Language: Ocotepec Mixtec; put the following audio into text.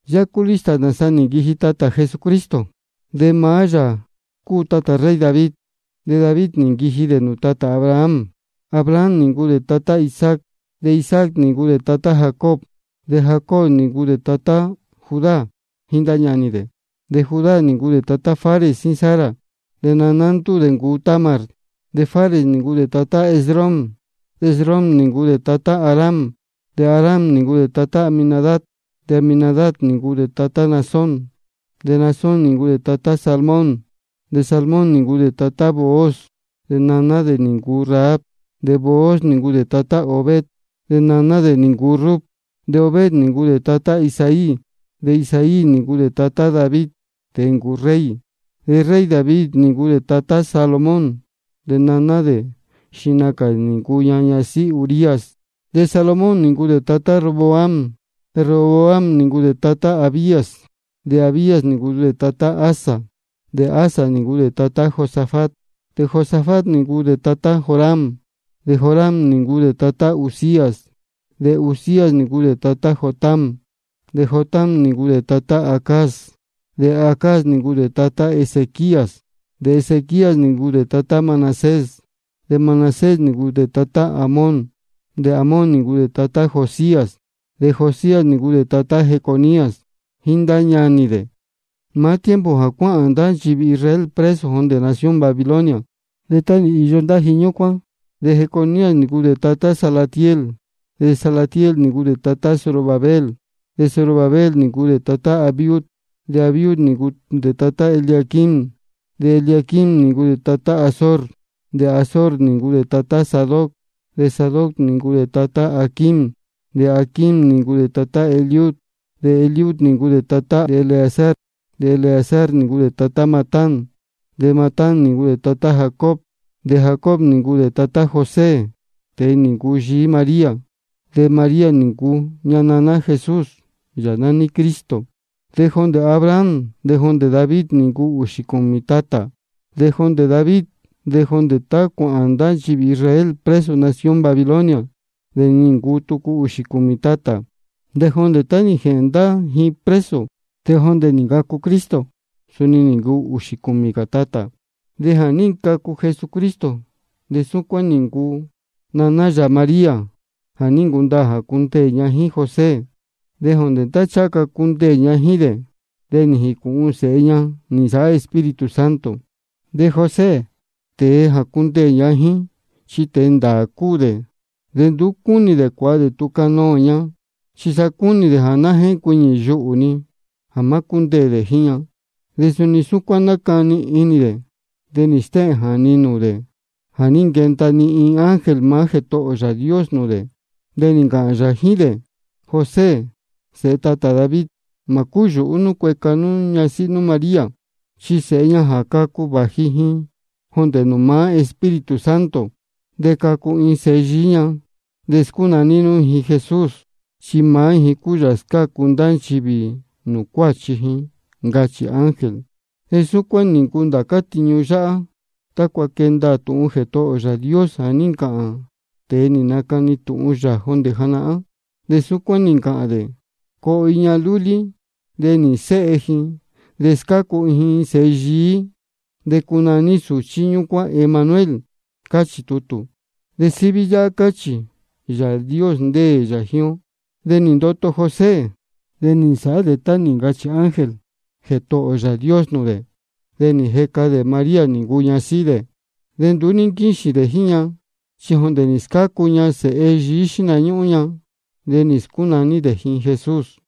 Yáhá cúu lista nāsa nī nquiji tatā Jesucristo. De maá yā cúu tatā rey David, de David nī nquiji nūū tatā Abraham. Abraham nī ncuu dē tatá Isaac, de Isaac nī ncuu dē tatá Jacob, de Jacob nī ncuu dē tatá Judá jíín ndá ñanī dē. De Judá nī ncuu dē tatá Fares jíín Zara, de naná ndúū dē nī ncuu Tamar. De Fares nī ncuu dē tatá Esrom, de Esrom nī ncuu dē tatá Aram. De Aram nī ncuu dē tatá Aminadab, de Aminadab nī ncuu dē tatá Naasón, de Naasón nī ncuu dē tatá Salmón. De Salmón nī ncuu dē tatá Booz, de naná dē nī ncuu Rahab. De Booz nī ncuu dē tatá Obed, de naná dē nī ncuu Rut. De Obed nī ncuu dē tatá Isaí. De Isaí nī ncuu dē tatá David, tēe nī ncuu rey. De rey David nī ncuu dē tatá Salomón, de naná dē, xihna cā nī ncuu ña ñasíhí Urías. De Salomón nī ncuu dē tatá Roboam, de Roboam nī ncuu dē tatá Abías, de Abías nī ncuu dē tatá Asa. De Asa nī ncuu dē tatá Josafat, de Josafat nī ncuu dē tatá Joram, de Joram nī ncuu dē tatá Uzías. De Uzías nī ncuu dē tatá Jotam, de Jotam nī ncuu dē tatá Acaz, de Acaz nī ncuu dē tatá Ezequías. De Ezequías nī ncuu dē tatá Manasés, de Manasés nī ncuu dē tatá Amón, de Amón nī ncuu dē tatá Josías. De Josías nī ncuu dē tatá Jeconías jíín ndá ñanī dē, maá tiempo jā cuáhān ndá nchivī Israel preso jondē nación Babilonia. De tá nī īyo ndá ji ñúcuán, de Jeconías nī ncuu dē tatá Salatiel. De Salatiel nī ncuu dē tatá Zorobabel. De Zorobabel nī ncuu dē tatá Abiud, de Abiud nī ncuu dē tatá Eliaquim, de Eliaquim nī ncuu dē tatá Azor. De Azor nī ncuu dē tatá Sadoc, de Sadoc nī ncuu dē tatá Aquim, de Aquim nī ncuu dē tatá Eliud. De Eliud nī ncuu dē tatá Eleazar, de Eleazar nī ncuu dē tatá Matán, de Matán nī ncuu dē tatá Jacob. De Jacob nī ncuu dē tatá José, tēe nī ncuu yií María. De María nī ncuu ña naná Jesús, Yāā nání Cristo. De jondē Abraham de jondē David de nī ncuu ūxī cūmī tatā. De jondē David de jondē tá cuāhān ndá nchivī Israel preso nación Babilonia de nī ncuu tucu ūxī cūmī tatā. De jondē tá nī jēhēn ndá ji preso de jondē nī ncacu Cristo, suni nī ncuu ūxī cūmī cā tatā. De jā ní ncacu Jesucristo de súcuán nī ncuu: Naná yā María, ja nī ncundaā jā cundeē ña jíín José. De jondē tá ncháha ca cundeē ña jíín dē, de nī jīcūhun sēhe ña nī nsāhá Espíritu Santo. De José, tēe jā cundeē ña jíín, chi tēe ndāā cúu dē. De nduú cúnī dē cuāha dē tūhun canoō ña, chi sa cúnī dē jā ná jéncuiñī yuhū-ni jā má cúndeē dē jíín ña. De juni súcuán nácani inī dē, de nī stéhēn jāni nūū dē jā ní nquenda-ni iin ángel maá Jētohō ō Yāā Dios nūū dē, de nī ncāhān yā jíín dē: José, sēhe tatā David, mā cúyūhú nú cueca nú ñasíhí nú María, chi sēhe ña jā cacu, vāji ji jondē nūū maá Espíritu Santo. De cacu iin sēhe yií ña. De scúnaní nú ji Jesús, chi maá ji cúu Yāā jā scácu ndá nchivī nūū cuáchi ji, ncachī ángel. Súcuán nī ncuu ndācá tiñu yáhá, tácua quee ndaā tūhun Jētohō ō Yāā Dios jā ní ncāhān tēe nī nacani tūhun yā jondē janahán. De súcuán nī ncāhān dē: Coo iin ñahan lúlí, de nīhīn séhe ji, de scácu ji iin sēhe yií, de cunaní sūchí ñúcuán Emanuel. Cáchī tutū. De síví yáhá cáchī: Yāā Dios ndéē yā jíín ó. De nī ndoto José, de nī nsāhá dē tá nī ncachī ángel Jētohō ō Yāā Dios nūū dē. De nī jeca dē María nī ncuu ña ñasíhí dē. De nduú ní nquíxīn dē jíín ña, chi jondē nī scácu ña sēhe yií xíhna ñúhún ña. De nī scúnaní dē ji Jesús.